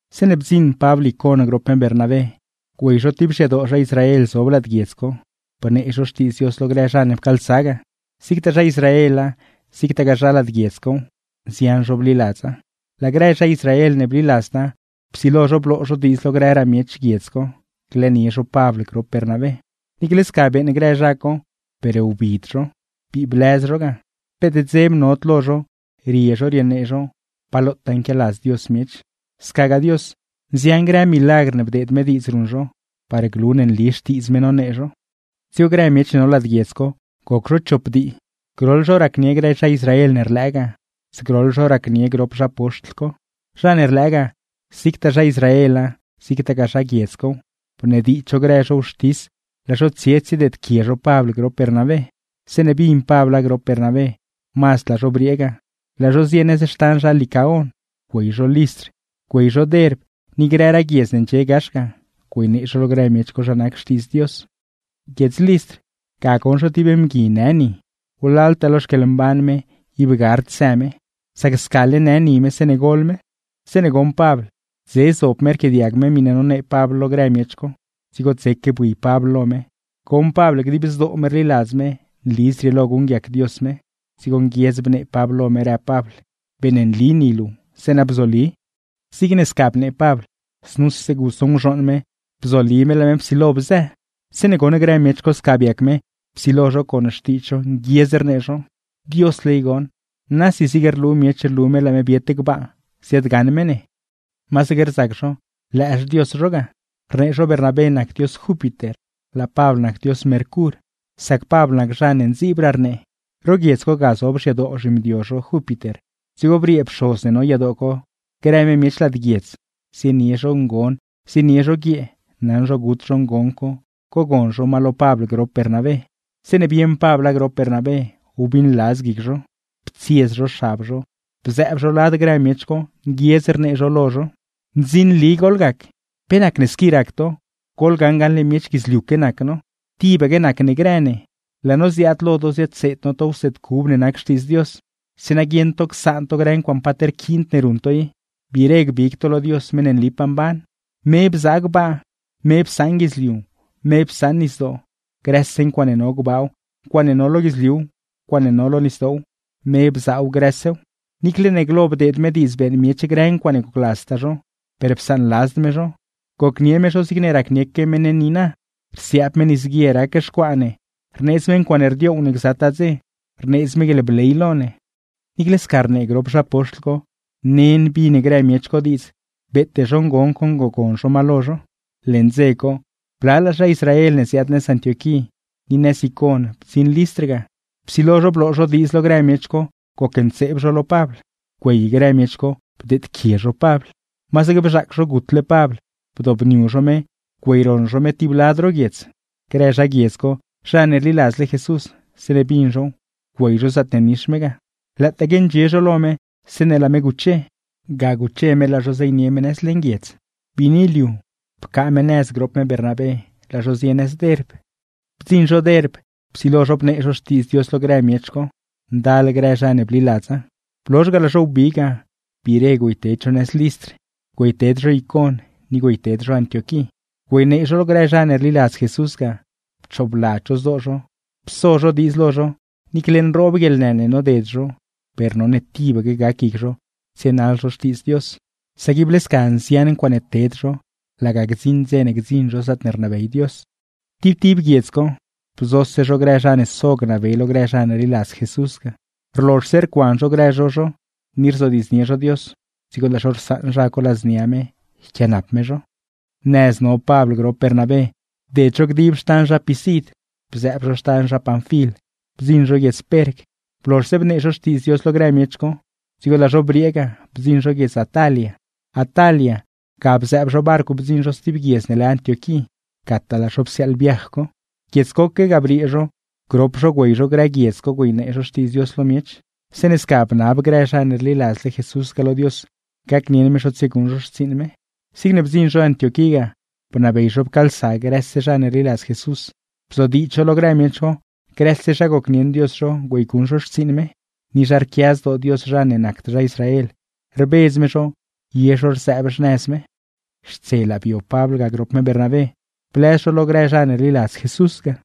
Zeeṉe bdziṉ Pabl Icon grop me Bernabé, güey zho tib xyadoo zha Israel zob lad guiedz co, bnee zho Xtiidz Dios lo grë zha ne pcaalsa ga. Zigtaa zha Israela, zigtagaa zha lad guiedz cow, nzian zho bliladza. Laa grë zha Israel ne bliladzda, psilo zho bloo zho diidz lo grëraa miech guiedz co glëënie zho Pabl grop Bernabé. Niicle sca beeṉ grë zha co per wbid zho, bii blëz zho ga, peet dzeb nod lo zho rie zho rienee zho Xtiidz Dios lo miech; scagaa Dios, nzian grë milagr ne bdeed me diidz ruṉ zho par glu ne nli Xtiidz me nonee zho. Dzigo grë miech ne no lad guiedz co goc zho chop dii, groḻ zho racnie grë zha Israel ne rlëë ga, zgroḻ zho racnie grop zha poxtl co. Zha ne rlëë ga, zigtaa zha Israela zigtagaa zha guiedz cow, bnediidz zho grë zho wxtis laa zho tsie tsiedeedquie zho Pabl grop Bernabé. Zeeṉe bin Pabla grop Bernabé, mazd laa zho briee ga, laa zho zie nëz xtan zha Licaon. (Güey zho Listr, güey zho Derb ni grëraa guiedz ne ndxie gax ga; güeynee zho lo grë miech co zha nac Xtiidz Dios.) Guiedz Listr ga goṉ zho ti mgui në ni, wlaltaa lo xquieḻmban me ib gard së me; sac scale në ni me zeeṉe gol me. Zeeṉe goṉ Pabl dze zob me rquiaadiag me miṉe nonee Pabl lo grë miech co, dzigo dzeque bui Pabl lo me, goṉ Pabl dib zdoo me rliladz me nli zrieelo guṉguiac Dios me; dzigo nguiedz bnee Pabl lo me, rëb Pabl: ―¡Beeṉnli ni luu, zeeṉa bzoli! Zigne sca bnee Pabl, znuse guso nguzhooṉ me, bzoli me laa me psilo bzë. Zeeṉe goṉ grë miech co sca biac me, psilo zho con xtiidz zho nguiedz rnee zho: ―¡Diosle i goṉ, nasi zig rlu miech rlu me laa me biet gbaa ziaadgaṉ me ne! ¡Masaque rzac zho lë xdios zho ga! Rnee zho Bernabé nac dios Júpiter, laa Pabl nac dios Mercur, sac Pabl nac zha ne ndziibraa rnee. Ro guiedz co ga zob xyadoo zhimdio zho Júpiter, dzigo briee pxoz ne no yadoo co grë me miech lad guiedz, zienie zho ngon, zienie zho guiee, naṉ zho gut zho ngon co cogon zho ma lo Pabl grop Bernabé. Zeeṉe bieṉ Pabla grop Bernabé wbiṉladz guic zho. Ptsiez zho xab zho, bzëëb zho lad grë miech co, nguiedz rnee zho lo zho: ―¡Ndzinli goḻgac! ¿Pe nacne squi rac to? ¡Goḻgaṉ gaṉle miech guidzliuque nac no, tibaque nac ne grë ne! Laa no ziaad lo to ziadseed no to wseed cub ne nac Xtiidz Dios, zeeṉa guieṉ to csaan to grë ncuaaṉe paat rquiind ne ruṉ to i, gbiire gbig to lo Dios meṉ ne nlipaa mban. Me bzaa gbaa, me psaṉ guidzliu, me psaṉ nisdoo, grëse ncuaaṉe no gbaaw, ncuaaṉe no lo guidzliuw, ncuaaṉe no lo nisdoow, me bzaaw grësew. Niicle ne glo bdeed me diidz beeṉ miech grë ncuaaṉe gocladztaa zho, per psaanladzd me zho. Gocnie me zho zigne racnieque me ne niina, rsiaab me nisguie rac xcuaa ne, rneedz me ncuaaṉe rdioow ne gzataa dze, rneedz me guieḻbley lo ne. Niicle sca rnee grop zha poxtl co, nen bin grë miech co diidz beete zho ngon co ngogon zho ma lo zho. Leṉ dze co, blalaa zha Israel ne ziaad nëz Antioquí ni nëz Icon bdziṉ Listr ga. Psilo zho bloo zho diidz lo grë miech co gocntseeb zho lo Pabl; güey grë miech co bdeedquie zho Pabl. Masaque bzhaac zho gutle Pabl, bdobniu zho me güeyroṉ zho me tiblad ro guiedz. Grë zha guiedz co zha ne rliladzle Jesús, zeeṉe bin zhow, güey zho zaatne nix me ga. Lëëtaaque ndxie zho lo me, zeeṉe laa me guche; ga guche me laa zho zeynie me nëz leṉ guiedz. Biini liu, pcaa me nëz grop me Bernabé laa zho zie nëz Derb. Bdziṉ zho Derb, psilo zho bnee zho Xtiidz Dios lo grë miech co; ndal grë zha ne bliladza. Blozh ga, laa zho wbi ga biire güeyted zho nëz Listr, güeyted zho Icon, ni güeyted zho Antioquí, güeynee zho lo grë zha ne rliladz Jesús ga, pchoobladz zho zdoo zho, pso zho diidz lo zho, niicle nroob guieḻnë ne noded zho per none tibaque gac guic zho tsienaḻ zho Xtiidz Dios; sac ible sca nzian ncuaaṉe ted zho laga gdziṉ dze ne gdziṉ zho zaatne rnabey Dios. Tib tib guiedz co, bzose zho grë zha ne so gnabey lo grë zha ne rliladz Jesús ga; rlozhse rcuan zho grë zho zho ni rzodiidznie zho Dios, dzigo laa zho rsaṉ zha co ladznia me yquianap me zho. Nëz no Pabl grop Bernabé bded zho dib xtan zha Pisid, bzëëb zho xtan zha Panfil, bdziṉ zho guiedz Perg. Blozhse bnee zho Xtiidz Dios lo grë miech co, dzigo laa zho briee ga, bdziṉ zho guiedz Atalia. Atalia ga bzëëb zho barcw bdziṉ zho sti guiedz ne lë Antioquí, gataa laa zho psiaaḻ viaj co. Guiedz coque ga briee zho grop zho güey zho grë guiedz co güeynee zho Xtiidz Dios lo miech; zeeṉe sca bnab grë zha ne rliladzle Jesús ga lo Dios gacnieṉ me zho tsieguṉ zho xtsiiṉ me. Zigne bdziṉ zho Antioquí ga, bnabey zho pcaalsa grëse zha ne rliladz Jesús, bzodiidz zho lo grë miech co grëse zha gocnieṉ Dios zho güeyguṉ zho xtsiiṉ me, ni zha rquia zdoo Dios zha ne nacd zha Israel rbedz me zho ye zho rzëëb xnëz me. Xtselaa bio Pabl ga grop me Bernabé, blëz zho lo grë zha ne rliladz Jesús ga.